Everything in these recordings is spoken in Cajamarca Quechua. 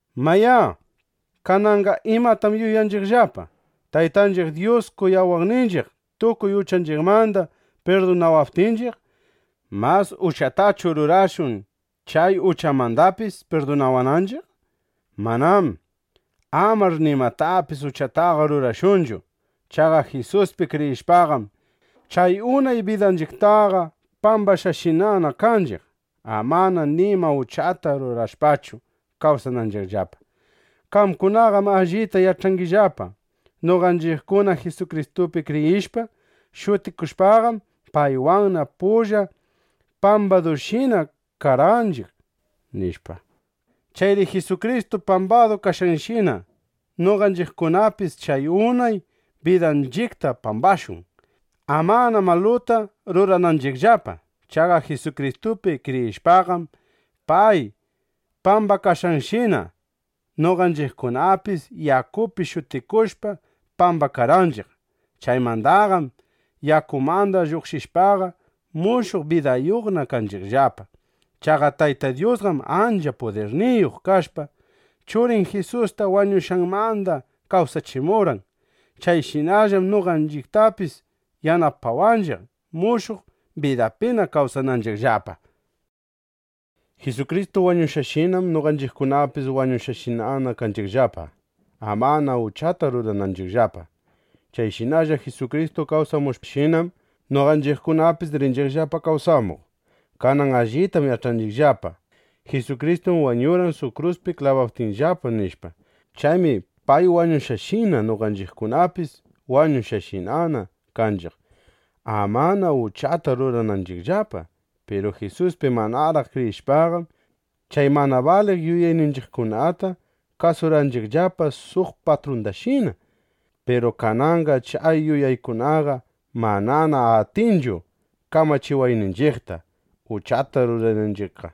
Mayá, kananqa ¿imatam yuyanchiqllapa? Taytanchiq Dyus kuyawaqninchiq, tukuy uchanchiqmanda pirdunawaptinchiq, ¿mas uchatachu rurashun, chay uchamandapis pirdunawananchiq? ¡Manám! ¡Amar nimatapis uchataqa rurashunchu! Chaqa Jisuspi kriyishpaqam, chay unay bidanchiqtaqa pambashqashinana kanchiq, amana nima uchata rurashpachu kawsananchiqllapa. Qamkunaqam allita yach'angillapa: Noqanchiqkuna Jisukristupi kriyishpa, shutikushpaqam, paywanna pulla pambadushina karqanchiq, nishpa. Chayri Jisukristu pambadu kashqanshina, noqanchiqkunapis chay unay bidanchiqta pambashun, amana maluta rurananchiqllapa. Chaqa Jisukristupi kriyishpaqam, pay pambakashqanshina noqanchiqkunapis yakupi shutikushpa pambakarqanchiq. Chaymandaqam yakumanda lluqshishpaqa, mushuq bidayuqna kanchiqllapa. Chaqa Tayta Dyusqam ancha pudirniyuq kashpa, Churin Jisusta wañushqanmanda kawsachimurqan. Chayshinallam noqanchiqtapis yanapawanchiq, mushuq bidapina kawsananchiqllapa. Jisukristu wañushqanshinam noqanchiqkunapis wañushqashinana kanchiqllapa, amana uchata rurananchiqllapa. Chayshinalla Jisukristu kawsamushqanshinam, noqanchiqkunapis rinchiqllapa kawsamuq. Kanan allitam yach'anchiqllapa: Jisukristum wañurqan suq kruspi klabaptinllapa, nishpa. Chaymi pay wañushqanshina, noqanchiqkunapis wañushqashinana kanchiq, amana uchata rurananchiqllapa. Piru Jisuspi manaraq kriyishpaqam, chay mana baliq yuyayninchiqkunata kasurqanchiqllapa suq patrundashina. Piru kananqam chay yuyaykunaqa manana atinchu kamachiwayninchiqta, uchata rurananchiqqa.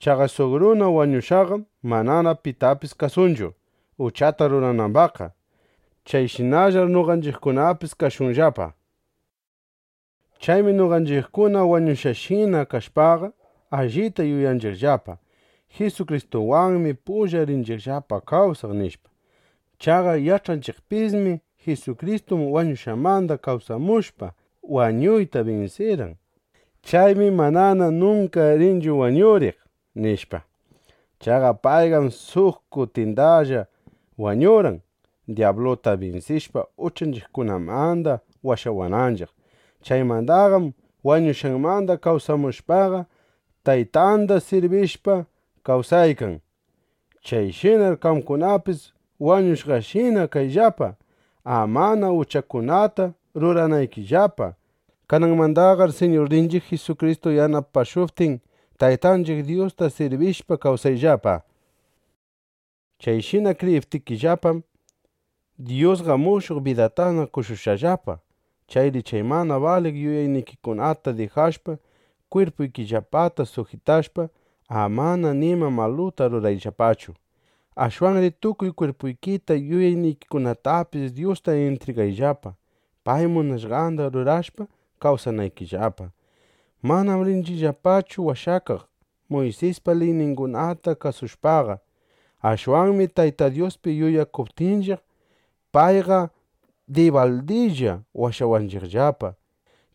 Chaqa suq runa wañushqaqam manana pitapis kasunchu, uchata ruranambaqqa. (Chayshinallar noqanchiqkunapis kashunllapa). Chaymi noqanchiqkuna wañushqashina kashpaqa, allita yuyakunchiqllapa: Jisukristuwanmi pulla rinchiqllapa kawsaq, nishpa. Chaqa yach'anchiqpismi: Jisukristum wañushqanmanda kawsamushpa, wañuyta binsirqan. Chaymi manana nunka rinchu wañuriq, nishpa. Chaqa payqam suq kutindalla wañurqan, dyabluta binsishpa, uchanchiqkunamanda washawananchiq. Chaymandaqam wañushqanmanda kawsamushpaqa, Taytanda sirbishpa kawsaykan. Chayshinar qamkunapis wañushqashina kayllapa, amana uchakunata ruranaykillapa. Kananmandaqar Siñurninchiq Jisukristu yanapashuptin, Taytanchiq Dyusta sirbishpa kawsayllapa. Chayshina kriyiptikillapam, Dyusqa mushuq bidatana qoshushqallapa. Chayri chay mana baliq yuyaynikikunata dijashpa, kwirpuykillapata sujitashpa, amana nima maluta rurayllapachu. Ashwanri tukuy kwirpuykita, yuyaynikikunatapis Dyusta intrigayllapa, pay munashqanda rurashpa kawsanaykillapa. Manam rinchiqllapachu washakaq Muysispa liyningunata kasushpaqa. Ashwanmi Tayta Dyuspi yuyakuptinchiq, payqa dibaldilla washawanchiqllapa.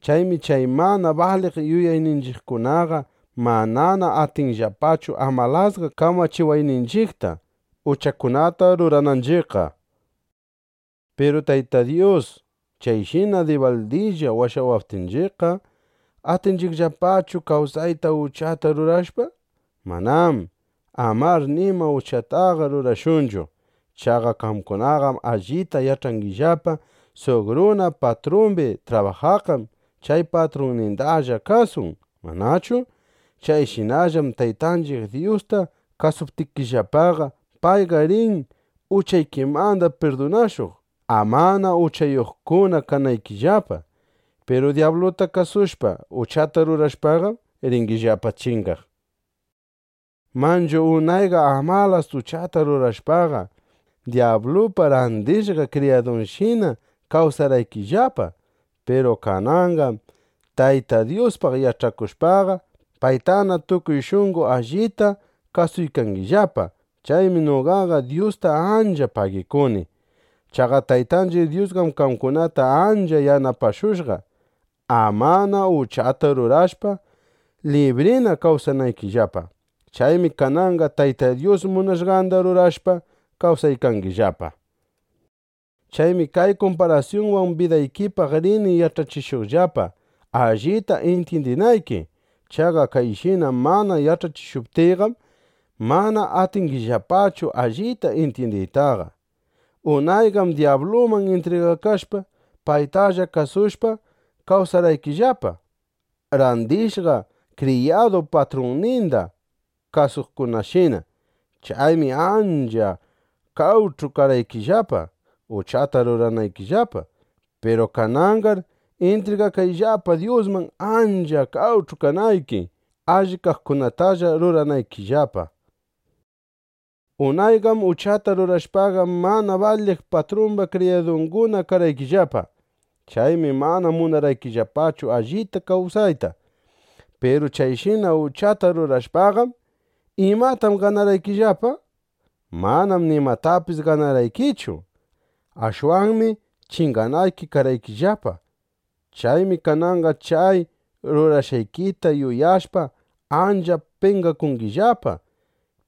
Chaymi chay mana baliq yuyayninchiqkunaqa manana atinllapachu amalasqa kamachiwayninchiqta, uchakunata rurananchiqqa. Piru Tayta Dyus chayshina dibaldilla washawaptinchiqqa, ¿atinchiqllapachu kawsayta uchata rurashpa? ¡Manám! ¡Amar nima uchataqa rurashunchu! Chaqa qamkunaqam allita yach'angillapa: Suq runa patrumbi trabajaqqam chay patrunnindalla kasun, ¿manachu? Chayshinallam Taytanchiq Dyusta kasuptikillapaqa, payqa rin uchaykimanda pirdunashuq, amana uchayuqkuna kanaykillapa. Piru dyabluta kasushpa, uchata rurashpaqam, ringillapa chingaq. Manchu unayqa amalas uchata rurashpaqa, dyablupa randishqa kriyadunshina kawsarqaykillapa. Piru kananqam Tayta Dyuspaq yach'akushpaqa, paytana tukuy shunqo allita kasuykangillapa. Chaymi noqaqa Dyusta ancha pagikuni. Chaqa Taytanchiq Dyusqam qamkunata ancha yanapashushqa, amana uchata rurashpa, librina kawsanaykillapa. Chaymi kananqa Tayta Dyus munashqanda rurashpa kawsaykangillapa. Chaymi kay kumparasyunwan bidaykipaq rini yach'achishuqllapa, allita intyindinayki. Chaqa kayshina mana yach'achishuptiyqam, mana atingillapachu allita intyindiytaqa. Unayqam dyabluman intrigakashpa, paytalla kasushpa, kawsarqaykillapa, randishqa kriyadu patrunninda kasuqkunashina. Chaymi ancha qawch'u karqaykillapa, uchata ruranaykillapa. Piru kananqar intrigakayllapa Dyusman, ancha qawch'u kanayki, alli kaqkunatalla ruranaykillapa. Unayqam uchata rurashpaqa, mana baliq patrumba kriyadunguna karqaykillapa. Chaymi mana munarqaykillapachu allita kawsayta. Piru chayshina uchata rurashpaqam, ¿imatam ganarqaykillapa? ¡Manam nimatapis ganarqaykichu! Ashwanmi chinganayki karqaykillapa. Chaymi kananqa chay rurashqaykita yuyashpa, ancha penqakungillapa.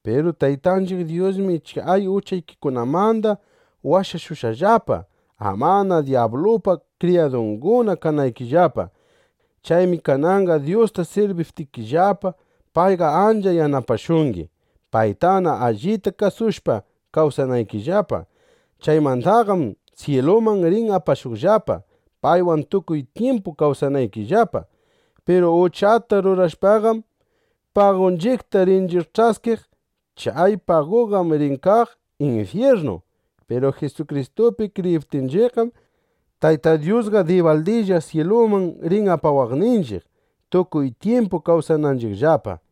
Piru Taytanchiq Dyusmi chay uchaykikunamanda washashushqallapa, amana dyablupa kriyadunguna kanaykillapa. Chaymi kananqa Dyusta sirbiptikillapa, payqa ancha yanapashungi, paytana allita kasushpa kawsanaykillapa. Chaymandaqam syiluman rin apashuqllapa, paywan tukuy tyimpu kawsanaykillapa. Piru uchata rurashpaqam, pagunchiqta rinchiq ch'askiq. Chay paguqam rin kaq infyirnu. Piru Jisukristupi kriyiptinchiqqam, Tayta Dyusqa dibaldilla syiluman rin apawaqninchiq, tukuy tyimpu kawsananchiqllapa.